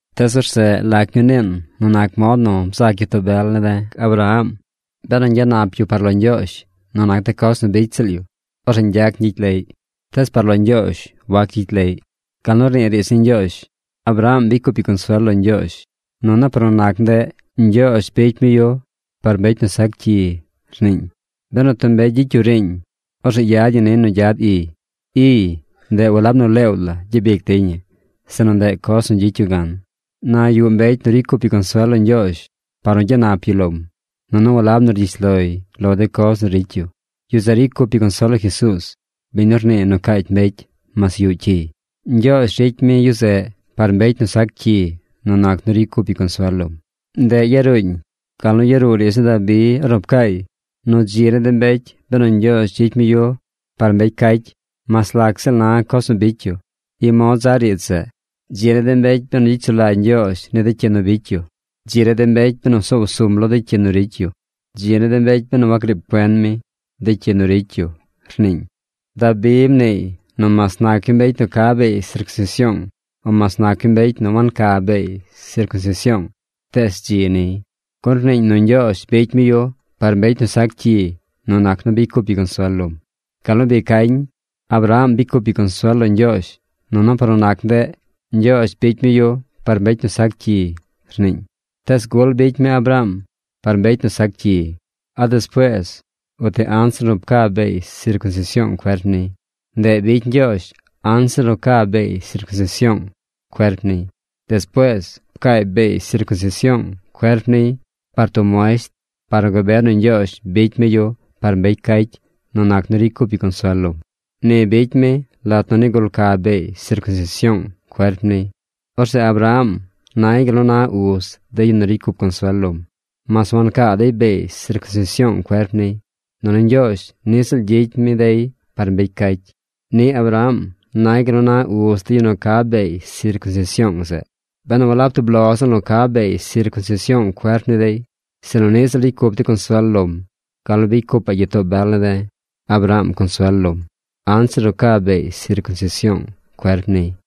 Tees orzeꞌ ¿lac ñuu niin nu nac mod nu bzac gyitoo bel ne̱ de̱ Abraham? Benu ñgyanap yu par lo Ñgyoozh nu nac de coz nu bicy ziꞌl yu, orzeꞌ ñgyac ñgyicy leꞌy. Tees par lo Ñgyoozh wac gyicy leꞌy. Gal nu rnii riidz ni Ñgyoozh: “Abraham bicy cup yu consuel lo Ñgyoozh, nunu par nu nac ndeꞌ, Ñgyoozh bicy mi yu par mbecy nu sac cyi”, rniiñ. Benu tub mbecy gyicy yu riiñ, orzeꞌ yad ñi niy nu gyad iy. Iy, ndeꞌ walab nu leew la gyabic dey ñi, sinu ndeꞌ coz nu gyicy yu gan. Na yuꞌ mbecy nu ricy cup yu consuel lo Ñgyoozh par nu gyanap yu lom, nunu walab nu rgyish loy lo de coz nu ricy yu. Yu zeꞌ ricy cup yu consuel lo Jesuuz, biñ nu rnii nu caacy mbecy mas yuꞌ cyiy. Ñgyoozh ricy mi yu zeꞌ par mbecy nu sac cyi nu nac nu ricy cup yu consuel lom. Ndeꞌ yaruuñ gal nu yaruu riidz ni Dabi ornu pcaay nu dzi ni de mbecy benu Ñgyoozh gyicy mi yu par mbecy cacy mas lac ziꞌl na coz nu bicy yu. I mod za riidz zeꞌ: ¡Dzi ni de mbecy benu gyicy sulagy Ñgyoozh ni de cyi nu bicy yu! ¡Dzi ni de mbecy benu soow sum lo de cyi nu ricy yu! ¡Dzi ni de mbecy benu wagriib cuen mi de cyi nu ricy yu!, rniiñ. Dabi mniiy nu mas nac yu mbecy nu ca beey sircunsision o mas nac yu mbecy nu wanca beey sircunsision, tees dzi niy, gun rniiñ nu Ñgyoozh bicy mi yu par mbecy nu sac cyi nu nac nu bicy cup yu consuel lom. Gal nu bi cañ: “Abraham bicy cup yu consuel lo Ñgyoozh, nunu par nu nac ndeꞌ, Ñgyoozh bicy mi yu par mbecy nu sac cyi”, rniiñ. ¿Tees gul bicy mi Abraham par mbecy nu sac cyi? ¿A despuees uti anzir nu pca beey sircunsision cuerp niy? Ndeꞌ bicy Ñgyoozh anzir nu ca beey sircunsision cuerp niy. Despuees, pcaay beey sircunsision cuerp niy par tub muesht par nu gabe nu Ñgyoozh bicy mi yu par mbecy cacy nu nac nu ricy cup yu consuel lom. Ni bicy mi lat nu nigul ca beey sircunsision cuerp niy. Orzeꞌ Abraham nay gal nu na uz de yu nu ricy cup consuel lom, mas wancaa dey beey sircunsision cuerp niy. Nunu Ñgyoozh niꞌ ziꞌl gyicy mi dey par mbecy cacy. Niꞌ Abraham nay gal nu na uz de yu nu ca beey sircunsision zeꞌ, benu walab tub lo ziꞌl nu ca beey sircunsision cuerp ni dey, sinu niꞌ ziꞌl ricy cup dey consuel lom gal nu bicy cupa̱ꞌ gyitoo bel ne̱ de̱, Abraham consuel lom anzir nu ca beey sircunsision cuerp niy.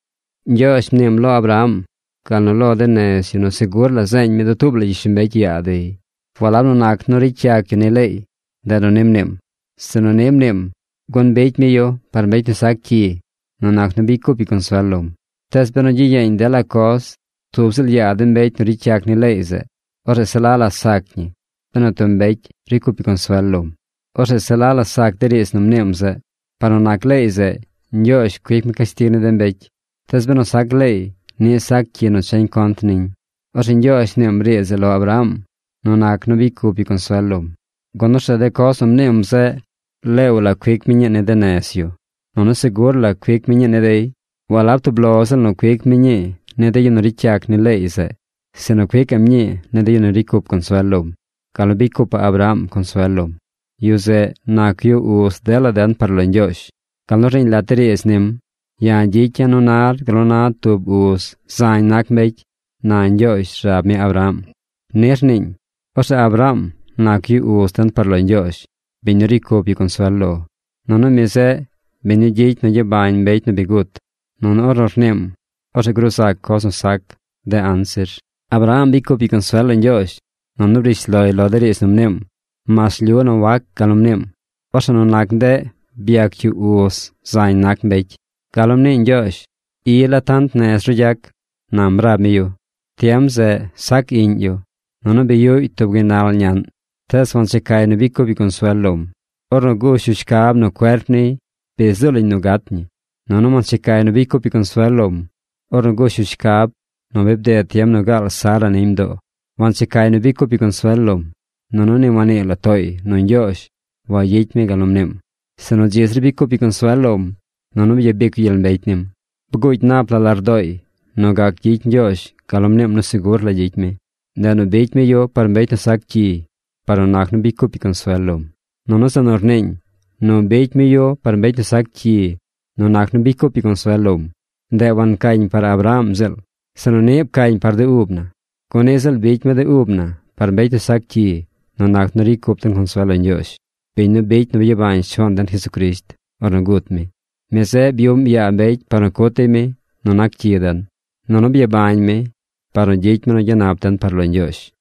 Ñgyoozh mniim lo Abraham gal nu lo de nez yu nu segur la zeeñ mi dutuub la gyishlombecy yaa dey. Walab nu nac nu ricy yac yu ni leey, ndeꞌ nu ni mniim, sinu ni mniim, gun bicy mi yu par mbecy nu sac cyi nu nac nu bicy cup yu consuel lom. Tees benu gyiyeeñ dela coz tub ziꞌl yaa de mbecy nu ricy yac ni leey zeꞌ, orzeꞌ se la la sac ñi benu tub mbecy ricy cup yu consuel lom. Orzeꞌ se la la sac de riidz nu mniim zeꞌ. Par nu nac leey zeꞌ, Ñgyoozh cuic mi cashtig ni de mbecy. Tees benu sac leey, niꞌ sac cyi nu cha contr niñ. Orzeꞌ Ñgyoozh mniim riidz zeꞌ lo Abraham nu nac nu bicy cup yu consuel lom, gun orzeꞌ de coz nu mniim zeꞌ leew la cuic mi ñii ni de nez yu, nunu segur la cuic mi ñii ni dey. Walab tub lo ziꞌl nu cuic mi ñii ni de yu nu ricy yac ni leey zeꞌ, sinu cuicaꞌm ñii ni de yu nu ricy cup consuel lom gal nu bicy cupaꞌ Abraham consuel lom. Yu zeꞌ, nac yu uz dela den par lo Ñgyoozh, gal nu rniiñ lat de riidz nim: “Ya̱ gyicya̱ nu nar gal nu na tub uz zañ nac mbecy, na Ñgyoozh rab mi Abraham.” Ni rniiñ. Orzeꞌ Abraham nac yu uz den par lo Ñgyoozh, biñ nu ricy cup yu consuel lo. Nunu mi zeꞌ biñ nu gyicy nu gyabañ mbecy nu bi gut. Nunu ornu rniim, orzeꞌ gruu zac coz nu sac de anzir. Abraham bicy cup yu consuel lo Ñgyoozh, nunu briish loy lo de riidz nu mniim, mas rlyu nu wac gal nu mniim. Orzeꞌ nu nac ndeꞌ byac yu uz zañ nac mbecy. Gal nu mnii Ñgyoozh: “I la tant nez ru gyac”, nam rab mi yu. Tiem zeꞌ sac iꞌñ yu, nunu bi yuꞌy tub gaynal ñaꞌn. Tees wanchecay nu bicy cup yu consuel lom ornu gush yu shcab nu cuerp niy bi zuu lañ nu gat ñi. Nunu wanchecay nu bicy cup yu consuel lom ornu gush yu shcab nu bi bded tiem nu gaal Sara niy mdoo. Wanchecay nu bicy cup yu consuel lom, nunu ni wannii la tooy nu Ñgyoozh wagyicy mi gal nu mniim, sinu dzi zir bicy cup yu consuel lom, nunu byabic yu gyel mbecy nim. Bguugy nap la lardooy nu gac gyicy Ñgyoozh gal nu mniim nu segur la gyicy mi. Ndeꞌ nu bicy mi yu par mbecy nu sac cyi par nu nac nu bicy cup yu consuel lom. Nunu zeꞌ nu rniiñ, “Nu bicy mi yu par mbecy nu sac cyi nu nac nu bicy cup yu consuel lom”, ndeꞌ wancañ par Abraham ziꞌl, sinu niꞌ pcañ par de ub na, gun niꞌ ziꞌl bicy mi de ub na par mbecy nu sac cyi nu nac nu ricy cup den consuel lo Ñgyoozh, biñ nu bicy nu byabañ Shuaan den Jesucrisht ornu gut mi. Mi zeꞌ byuꞌm yaa mbecy par nu cut dey mi nu nac cyi den. Nunu byabañ mi par nu gyicy mi nu gyanap den par lo Ñgyoozh.